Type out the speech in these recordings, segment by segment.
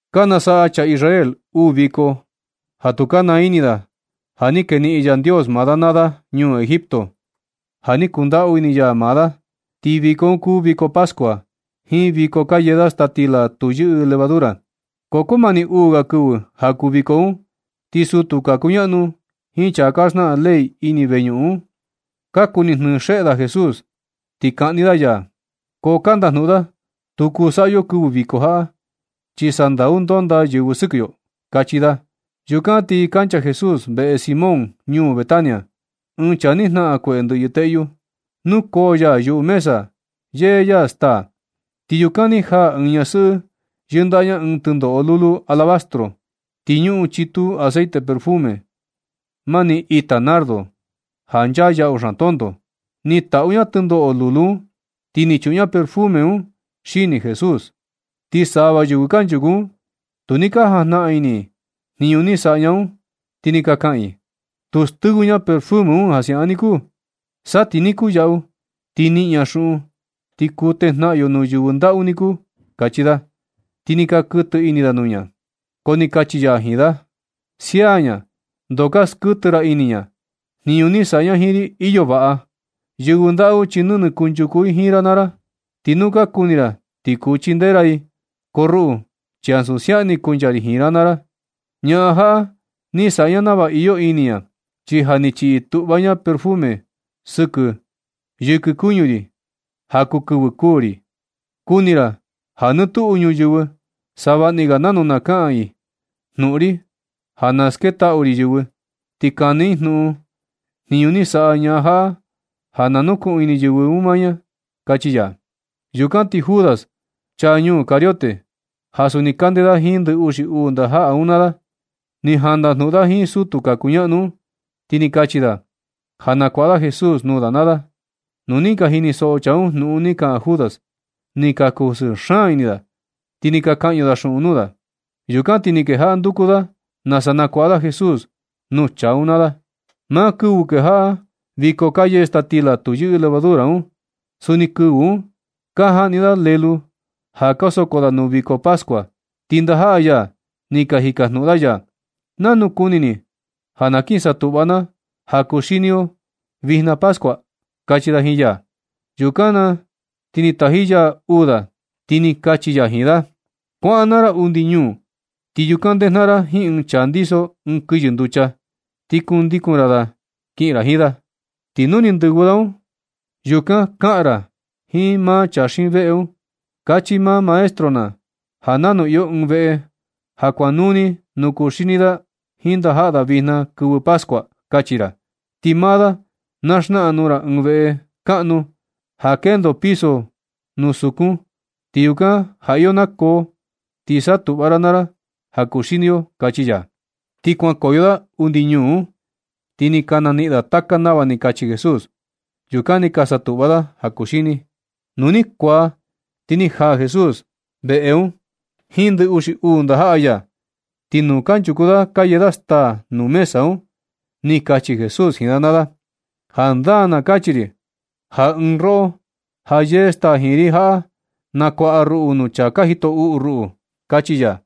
Ka nasaꞌa chaa Israel uu viko ja tu ka naa ini da na ni keniꞌin Yandios maa da naa da ñuu Egipto, ja ni kundaꞌu ini ya maa da. Ti viko un kuu viko pascua, jiin viko ka yee da staa stila tu yɨꞌɨ levadura. Ko kumani uu ga kɨvɨ ja kuu viko un. Ti sutu ka kuñaꞌnu jiin chaa ka xnaꞌan ley ini veñuꞌun un, ka kuni jnɨɨ xeꞌe da Jesús, ti kaꞌni da ya. Ko ka ndajnuꞌun da: ―Tu kuu saꞌa yo kɨvɨ viko jaꞌa, chi sandau ndondaa yɨvɨ sɨkɨ yo ―kachi da. Yukan ti kancha Jesús veꞌe Simón ñuu Betania, ɨɨn chaa ni jnaꞌan kueꞌe ndɨꞌyɨ teꞌyu. Nukoo ya yuꞌu mesa yee ya staa. Ti yukan ni jaa ɨɨn ñasɨꞌɨ yɨndaꞌa ña ɨɨn tɨndoꞌo lulu alabastro. Ti ñuꞌun chitu aceite perfume mani ita nardo, ja nchaa yaꞌu xaan tonto. Ni taꞌu ña tɨndoꞌo lulu un, ti ni chuꞌun ña perfume un xini Jesús. Ti sava yɨvɨ kanchuku un, tu ni ka jajnaꞌan ini i jniñu saꞌa ña un. Ti ni ka kaꞌan i: ―Tu stɨvɨ ña un perfume un siaꞌan niku. Sa ti ni kuyaꞌu, ti niꞌin ña xuꞌun ti kuu tejnaꞌan yo nuu yɨvɨ ndaꞌu niku ―kachi da. Ti ni ka kɨtɨ ini da nuu ña. Ko ni kachi ya jiin da: ―Sia ña, ndoo ka skɨtɨ ra ini ña. Jniñu ni saꞌa ña jiin ri, iyo vaꞌa. Yɨvɨ ndaꞌu, chi nɨnɨ kanchuku i jiin ra naa ra, ti nu ka kuni ra ti kuu chindee ra i. Ko ruꞌu, chi ansu siaꞌan ni kuncha ri jiin ra naa ra. Ñaꞌan jaꞌa ni saꞌa ña nava iyo ini ña, chi ja ni chiꞌi tuꞌva ña perfume yɨkɨ kuñu ri ja kuu kɨvɨ kuū ri. Kuni ra ja nɨ tuꞌu ñuyɨvɨ, savaꞌni ga nanu na kaꞌan i jnuꞌun ri ja na sketaꞌu ri yɨvɨ, ti kani i jnuꞌun jniñu ni saꞌa ña jaꞌa ja na nukuꞌun ini yɨvɨ un maa ña ―kachi ya. Yukan ti Judas, ɨɨn chaa ñuu Cariote, ja suni kandee da jiin ndɨ uxi uu ndajaꞌa un naa da, ni jaꞌan ndajnuꞌun da jiin sutu ka kuñaꞌnu un, ti ni kachi da ja nakuaꞌa da Jesús nuu da naa da. Nu ni ka jinisoꞌo chaa un jnuꞌun ni kaꞌan Judas, ni ka kusɨɨ xaan ini da, ti ni ka kaꞌñu da xuꞌun nuu da. Yukan ti ni kejaꞌa nduku da nasa nakuaꞌa da Jesús nuu chaa un naa da. Maa kɨvɨ kejaꞌa viko ka yee staa stila tu yɨꞌɨ levadura un, suni kɨvɨ un ka jaꞌni da lélú ja ka soko da ja kuu viko pascua. Ti ndajaꞌa ya ni ka jikajnuꞌun da ya: ―¿Nanu kuni ni ja na kin satuꞌva na ja kuxini yo vijna pascua? ―kachi da jiin ya. Yukan na ti ni taji ya uu da, ti ni kachi ya jiin da: ―Kuaꞌan naa ra undi ñuu, ti yukan ndejnaꞌan ra jiin ɨɨn chaa ndiso ɨɨn kɨyɨ nducha, ti kundikun ra da kiꞌin ra jiin da. Ti nuu ndɨvɨ da un, yukan kaꞌan ra jiin maa chaa xiin veꞌe un: “Kachi maa Maestro na ja nanu iyo ɨɨn veꞌe ja kuaꞌanuu ni nuu kuxini da jiin ndajaꞌa da vijna kɨvɨ pascua”, kachi ra. Ti maa da na xnaꞌan nuu ra ɨɨn veꞌe kaꞌnu ja kendo piso nuu sukun, ti yukan ja iyo nakoo, ti satuꞌva ra naa ra ja kuxini yo ―kachi ya. Ti kuankoyo da undi ñuu un, ti ni ka naniꞌin da taka nava ni kachi Jesús. Yukan ni ka satuꞌva da ja kuxini. Nu ni kuaa, ti ni jaa Jesús veꞌe un jiin ndɨ uxi uu ndajaꞌa ya. Ti nu kanchuku da ka yee da staa nuu mesa un, ni kachi Jesús jiin da naa da: ―Jandaa na kachi ri ja ɨɨn roꞌo ja yee staa jiin ri jaꞌa, nakuaꞌa ruꞌu nuu chaa ka jito uꞌu ruꞌu ―kachi ya.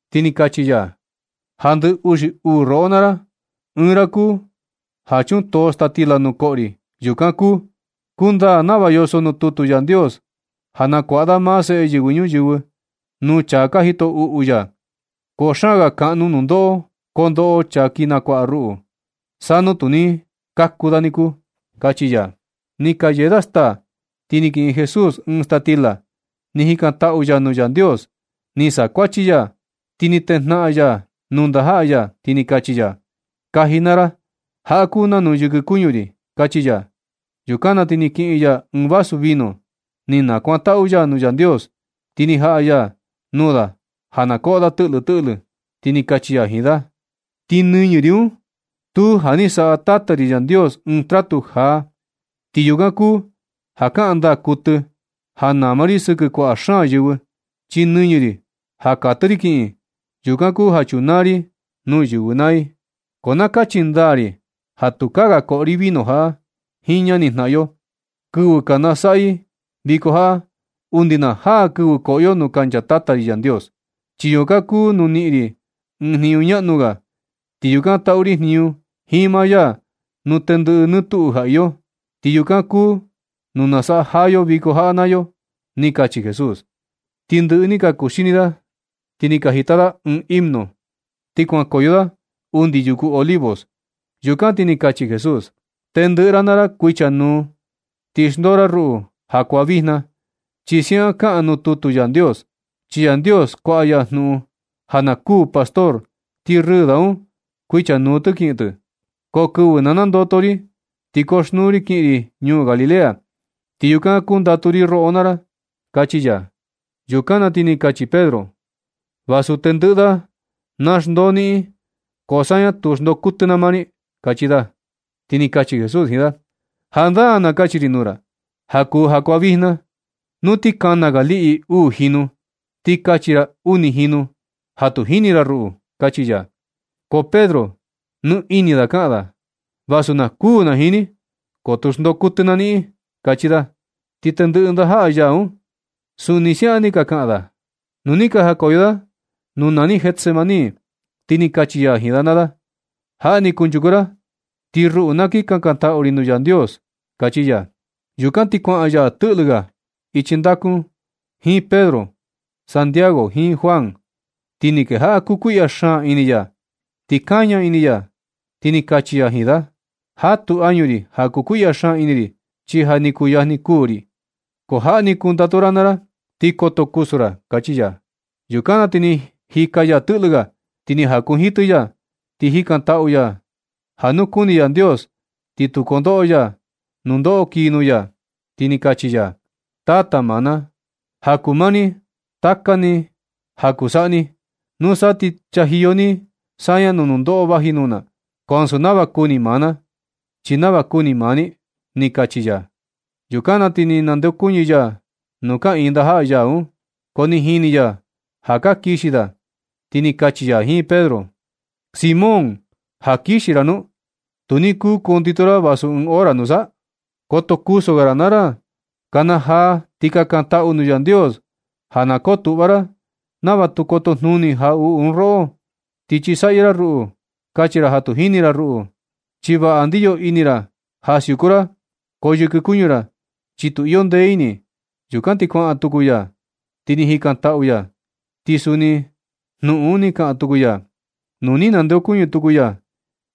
Ti ni kachi ya: ―Ja ndɨ uxi uu roꞌo naa ra ɨɨn ra kuu, ja chutoo staa stila nu koꞌo ri, yukan kuu. Kundaa nava yoso nuu tutu Yandios ja nakuaꞌa da maa seꞌe Yɨvɨ Ñuyɨvɨ nuu chaa ka jito uꞌu ya. Ko xaan ga kaꞌnu nundoꞌo kondoꞌo chaa kin nakuaꞌa ruꞌu. Sa nu tu ni kaku da niku ―kachi ya. Nɨ ka yee da staa. Ti ni kiꞌin Jesús ɨɨn staa stila, ni jikantaꞌu ya nuu Yandios, ni sakuachi ya, ti ni tejnaꞌan ya nuu ndajaꞌa ya, ti ni kachi ya: ―Kaji naa ra. Jaꞌa kuu nanu yɨkɨ kuñu ri ―kachi ya. Yukan na ti ni kiꞌin ya ɨɨn vaso vino, ni nakuantaꞌu ya nuu Yandios, ti ni jaꞌa ya nuu da ja na koꞌo da tɨꞌlɨ tɨꞌlɨ. Ti ni kachi ya jiin da: ―Ti nɨñɨ ri un stuu ja ni saꞌa Tata ri Yandios ɨɨn tratu jaa. Ti yukan kuu ja kaꞌan ndaa kuɨtɨ ja nama ri sɨkɨ kuaꞌa xaan yɨvɨ, chi nɨñɨ ri ja katɨ ri kiꞌin, yukan kuu ja chunaa ri nuu yɨvɨ naa i. Ko na kachi ndaa ri ja tukaa ga koꞌo ri vino jaꞌa jiin ñanijnaꞌan yo, kɨvɨ ka nasaꞌa i viko jaꞌa, undi na jaa kɨvɨ koꞌo yo nuu kancha Tata ri Yandios, chi yukan kuu nuu niꞌin ri ɨɨn jniñu ñaꞌnu ga, ti yukan taꞌu ri jniñu jiin maa ya nuu tendɨꞌɨ nɨ tuꞌu ja iyo. Ti yukan kuu nuu nasaꞌa jaa yo viko jaꞌa naa yo ―ni kachi Jesús. Ni ndɨꞌɨ ni ka kuxini da, ti ni ka jita da ɨɨn himno, ti kuankoyo da undi yuku Olivos. Yukan ti ni kachi Jesús: ―Tendɨꞌɨ ra naa ra kuichanuu ti xndoo ra ruꞌu jakuaa vijna, chi siaꞌan kaꞌan nuu tutu Yandios: “Chi Yandios, kuaꞌa ya jnuꞌun ja na kuū pastor, ti rɨɨ da un kuichanuu tɨ kiꞌin tɨ.” Ko kɨvɨ na nandoto ri, ti koxnuu ri kiꞌin ri ñuu Galilea, ti yukan kundatu ri roꞌo naa ra ―kachi ya. Yukan na ti ni kachi Pedro: ―Vasu tendɨꞌɨ da na xndoo niꞌin, ko saña tu xndoo kuɨtɨ na maa ni ―kachi da. Ti ni kachi Jesús jiin da: ―Jandaa na kachi ri nuu ra, ja kuu jakuaa vijna, nu ti kana ga liꞌi uu jinu, ti kachi ra uni jinu ja tu jini ra ruꞌu ―kachi ya. Ko Pedro, nɨ ini da kaꞌan da: ―Vasu na kuū na jiin ni, ko tu xndoo kuɨtɨ na niꞌin ―kachi da. Ti tendɨꞌɨ ndajaꞌa ya un, suni siaꞌan ni ka kaꞌan da. Nu ni ka jakoyo da nuu nani Getsemaní, ti ni kachi ya jiin da naa da: ―Jaꞌa ni kunchuku ra ti ruꞌu na kin kankantaꞌu ri nuu Yandios ―kachi ya. Yukan ti kuaꞌan ya tɨꞌlɨ ga ichi ndaku un jiin Pedro, Santiago jiin Juan. Ti ni kejaꞌa kukuiꞌya xaan ini ya, ti kaña ini ya. Ti kachi ya jiin da: ―Jatu añu ri ja kukuiꞌya xaan ini ri, chi ja ni kuyajni kuū ri. Ko jaꞌa ni kundatu ra naa ra ti koto kusu ra ―kachi ya. Yukan na ti ni jika ya tɨꞌlɨ ga, ti ni jakunjitɨ ya, ti jikantaꞌu ya, ja nu kuni Yandios, ti tu kondoꞌo ya nundoꞌo kii nuu ya. Ti ni kachi ya: ―Tata maa na, ja kuu maa ni, taka ni ja kuu saꞌa ni. Nusa ti chajiyo ni saña nuu nundoꞌo vaji nuu na. Ko ansu nava kuni maa na, chi nava kuni maa ni ―ni kachi ya. Yukan na ti na nandeokuñɨ ya nuu kaꞌiin ndajaꞌa ya un, ko ni jini ya ja ka kixi da, ti ni kachi ya jiin Pedro: ―Simón, ¿ja kixi ra nu? Tu ni kuu kundito ra vasu ɨɨn hora nusa. Koto kusu ga ra naa ra. Kanajaa, ti kakantaꞌu nuu Yandios ja na kotuꞌva ra nava tu kotojnuni jaꞌuꞌu un oꞌo, ti chisaꞌyɨ ra ruꞌu, kachi ra ja tu ka jini ra ruꞌu. Chi vaꞌa ndiyo ini ra ja siuku ra, ko yɨkɨ kuñu ra, chi tu iyo ndee ini. Yukan ti kuaꞌan tuku ya, ti ni jikantaꞌu ya, ti suni jnuꞌun un ni kaꞌan tuku ya. Nu ni nandeokuñɨ tuku ya,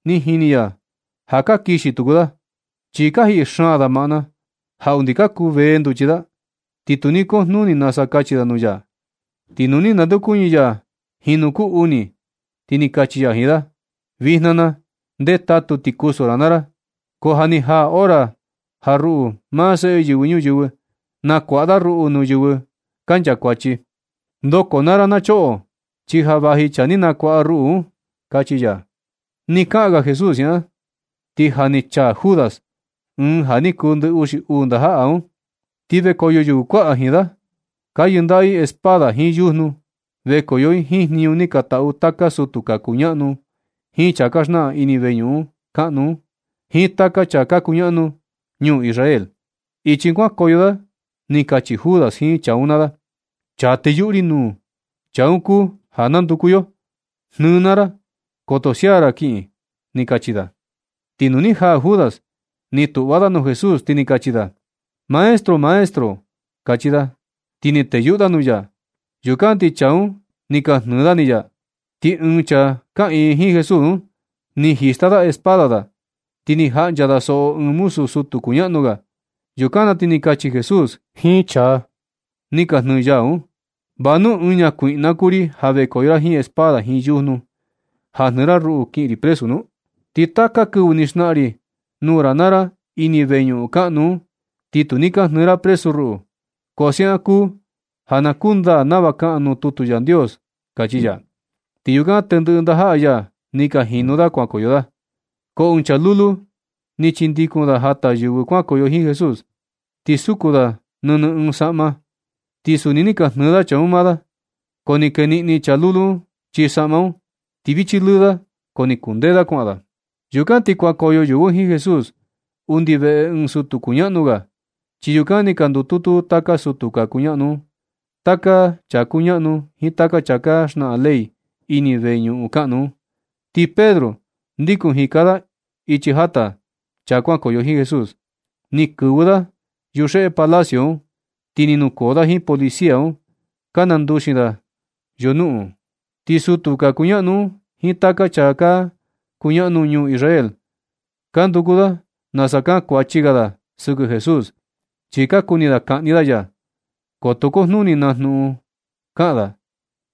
ni jini ya ja ka kixi tuku da, chi ka jiꞌi xaan da maꞌna ja undi ka kuvee nduchi da, ti tu ni kujnuni nasa kachi da nuu ya. Ti nu ni nandeokuñɨ ya jinu kuu uni, ni kachi ya jiin da: ―Vijna na, ndetatu ti kusu naa ra. Ko ja ni jaa hora ja ruꞌu, maa Seꞌe Yɨvɨ Ñuyɨvɨ, nakuaꞌa da ruꞌu nuu yɨvɨ ka nchakuachi. Ndoko naa ra na choꞌo, chi ja vaji chaa ni nakuaꞌa ruꞌu un ―kachi ya. Ni kaꞌan ga Jesús siaꞌan, ti ja ni chaa Judas, ɨɨn ja ni kuu ndɨ uxi uu ndajaꞌa un. Ti vekoyo yɨvɨ kuaꞌa jiin da, ka yɨndaꞌa i espada jiin yujnu. Vekoyo i jiin jniñu ni ka taꞌu taka sutu ka kuñaꞌnu jiin chaa ka xnaꞌan ini veñuꞌun kaꞌnu un jiin taka chaa ka kuñaꞌanu ñuu Israel. Ichi kuankoyo da ni kachi Judas jiin chaa un naa da: ―Chaa teyuꞌu ri nuu, chaa un kuu ja nanduku yo. Jnɨɨ naa ra. Koto sia ra kiꞌin ―ni kachi da. Ti nu ni jaa Judas, ni tuꞌva da nuu Jesús, ti ni kachi da: ―Maestro, maestro ―kachi da. Ti ni teyuꞌu da nuu ya. Yukan ti chaa un ni ka jnɨɨ ni da ya. Ti ɨɨn chaa kaꞌiin jiin Jesús un, ni jista da espada da, ti ni jaꞌncha da soꞌo ɨɨn muzu sutu kuñaꞌnu ga. Yukan na ti ni kachi Jesús jiin chaa ni ka jnɨɨ ya un: ―¿Va nu ɨɨn ñakuiꞌna kuu ri ja vekoyo ra jiin espada jiin yujnu ja jnɨɨ ra ruꞌu kiꞌin ri presu nu? Ti taka kɨvɨ ni xnaꞌan ri nuu ra naa ra ini veñuꞌun kaꞌnu un, ti tu ni ka jnɨɨ ra presu ruꞌu. Ko siaꞌan kuu ja na kundaa nava kaꞌan nuu tutu Yandios ―kachi ya. Ti yukan tendɨꞌɨ ndajaꞌa ya ni ka jinu da kuankoyo da. Ko ɨɨn chaa lulu ni chindikun da jata yɨvɨ kuankoyo jiin Jesús, ti suku da nɨnɨ ɨɨn saꞌma, ti suni ni ka jnɨɨ chaa un maa da. Ko ni keniꞌni chaa lulu un chii saꞌma un, ti vichi lɨɨ da, ko ni kundee da kuaꞌan da. Yukan ti kuankoyo yɨvɨ un jiin Jesús undi veꞌe ɨɨn sutu kuñaꞌnu ga, chi yukan ni ka ndututu taka sutu ka kuñaꞌnu un, taka chaa ka kuñaꞌnu jiin taka chaa ka xnaꞌan ley ini veñuꞌun kaꞌnu un. Ti Pedro ndikun jika da ichi jata chaa kuankoyo jiin Jesús, ni kɨvɨ da yuxeꞌe palacio un, ti ni nukoo da jiin policía un ka nanduxin da yunuꞌun. Ti sutu ka kuñaꞌnu un jiin taka chaa ka kuñaꞌanu ñuu Israel, ka nduku da nasa kaꞌan kuachi ga da sɨkɨ Jesús, chi ka kuni kaꞌni da ya. Ko tu kujnuni na jnuꞌun ga kaꞌan da.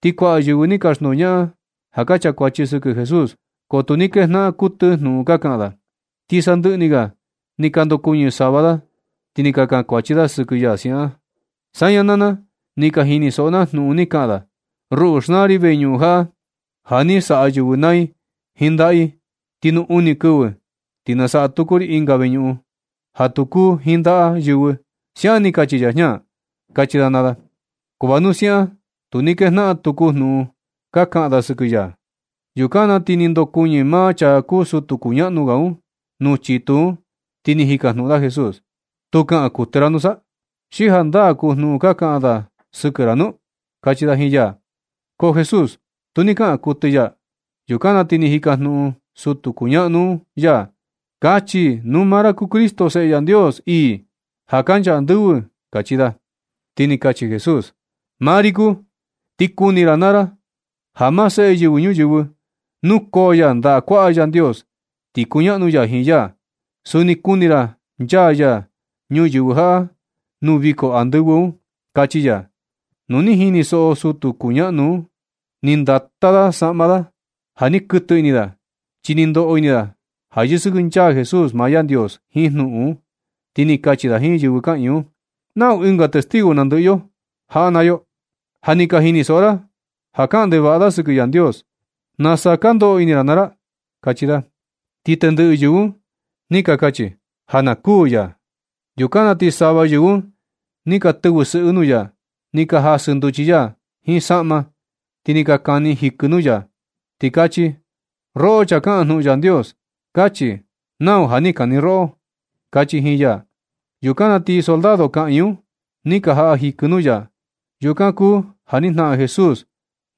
Ti kuaꞌa yɨvɨ ni ka xndoñaꞌan, ja ka chakuachi sɨkɨ Jesús, ko tu ni kejnaꞌan kuɨtɨ jnuꞌun ka kaꞌan da. Ti sandɨꞌɨ ni ga ni ka ndokuɨñɨ sava da, ti ni ka kankuachi da sɨkɨ ya siaꞌan: ―Saña naa na, ni ka jinisoꞌo na jnuꞌun ni kaꞌan da: “ruꞌu, xnaa ri veñuꞌun jaꞌa, ja ni ka saꞌa yɨvɨ naa i jiin ndajaꞌa i, ti nuu uni kɨvɨ, ti na saꞌa tuku ri ɨnga veñuꞌun ja tu kuu jiin ndaꞌa yɨvɨ”, siaꞌan ni kachi chaa jña ―kachi da naa da. Ko vasu siaꞌan, tu ni kejaꞌan tuku jnuꞌun ka kaꞌan da sɨkɨ ya. Yukan na ti ni ndokuɨñɨ maa chaa kuu sutu kuñaꞌnu ga un nuu chitu un, ti ni jikajnuꞌun da Jesús: ―¿Tu kaꞌan kuɨtɨ ra nusa? ¿Xi jandaa kuu jnuꞌun ka kaꞌan da sɨkɨ ra nu? ―kachi da jiin ya. Ko Jesús tu ni kaꞌan kuɨtɨ ya. Yukan na ti ni jikajnuꞌun tuku sutu kuñaꞌanu un ya: ―Kachi nu maa ra kuu Cristo, Seꞌe Yandios ii, ja kancha andɨvɨ ―kachi da. Ti ni kachi Jesús: ―Maa ri kuu, ti kuni ra naa ra ja maa Seꞌe Yɨvɨ Ñuyɨvɨ, nukoo ya ndaꞌa kuaꞌa Yandios ti kuñaꞌnu ya jiin ya. Suni kuni ra nchaa ya ñuyɨvɨ jaꞌa nuu viko andɨvɨ un ―kachi ya. Nu ni jinisoꞌo sutu ñaꞌnu ga un, ni ndata da saꞌma da ja ni kɨtɨ ini da, chi ni ndoꞌo ini da ja yɨsɨkɨnchaa Jesús maa Yandios jiin jnuꞌun un. Ti ni kachi da jiin yɨvɨ kaꞌiin un: ―¿Nau ɨnga testigo nandɨꞌɨ yo jaꞌa naa yo? Ja ni ka jinisoꞌo ra ja kaꞌan ndevaꞌa da sɨkɨ Yandios. ¿Nasa ka ndoꞌo ini ra naa ra? ―kachi da. Ti tendɨꞌɨ yɨvɨ un ni kachi ja na kuū ya. Yukan na ti sava yɨvɨ un ni ka tɨvɨ sɨꞌɨ nuu ya. Ni ka jasɨ nduchi ya jiin saꞌma, ti ni ka kani jikɨ nuu ya, ti kachi: ―roꞌo chaa kaꞌan jnuꞌun Yandios, kachi nau ja ni kani roꞌo ―kachi jiin ya. Yukan na ti soldado kaꞌiin un, ni ka jaꞌa jikɨ nuu ya. Yukan kuu ja ni jnaꞌan Jesús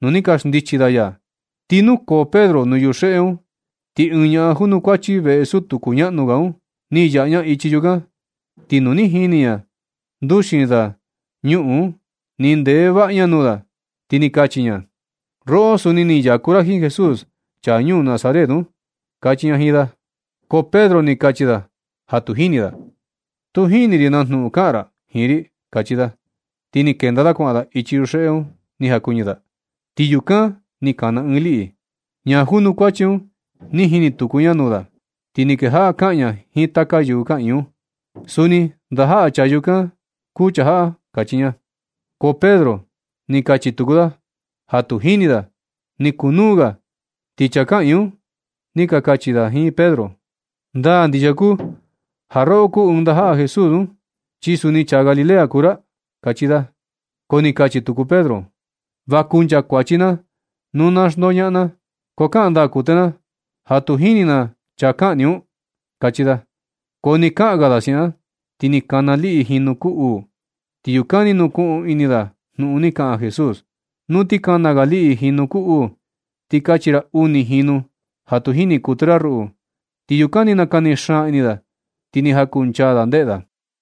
nu ni ka xndichi da ya. Ti nukoo Pedro nuu yuxeꞌe un, ti ɨɨn ñaꞌan junukuachi veꞌe sutu kuñaꞌanu ga un, ni yaꞌa ña ichi chukan. Ti nu ni jini ña nduxin da ñuꞌun, ni ndeꞌe vaꞌa ña nuu da, ti ni kachi ña: ―roꞌo, suni ni yaku ra jiin Jesús, chaa ñuu Nazaret un ―kachi ña jiin da. Ko Pedro ni kachi da ja tu jini da: ―Tu jini ri na jnuꞌun kaꞌan ra jiin ri ―kachi da. Ti ni kenda da kuaꞌan da ichi yuxeꞌe un ni jakuɨñɨ da. Ti yukan ni kana ɨɨn liꞌi. Ñaa junukuachi un, ni jini tuku ña nuu da, ti ni kejaꞌa kaꞌan ña jiin taka yɨvɨ kaꞌiin un: ―Suni ndajaꞌa chaa yukan kuu chaa jaꞌa ―kachi ña. Ko Pedro ni kachi tuku da ja tu jini da. Ni kuu nuu ga, ti chaa kaꞌiin un ni ka kachi da jiin Pedro: ―Ndaa ndixia kuu ja roꞌo kuu ɨɨn ndajaꞌa Jesús un, chi suni chaa Galilea kuu ra ―kachi da. Ko ni kachi tuku Pedro: ―Va kunchakuachi na nu na xndoñaꞌan na, ko kaꞌan ndaa kuɨtɨ na ja tu jini na chaa ka kaꞌan ni un ―kachi da. Ko nɨ kaꞌan ga da siaꞌan, ti ni kana liꞌi jinu kuu uu. Ti yukan ni nukuꞌun ini da jnuꞌun ni kaꞌan Jesús: “Nu ti kana ga liꞌi jinu kuu uu, ti kachi ra uni jinu ja tu jini kuɨtɨ ra ruꞌu.” Ti yukan ni nakani xaan ini da, ti ni jakunchaa da ndeꞌe da.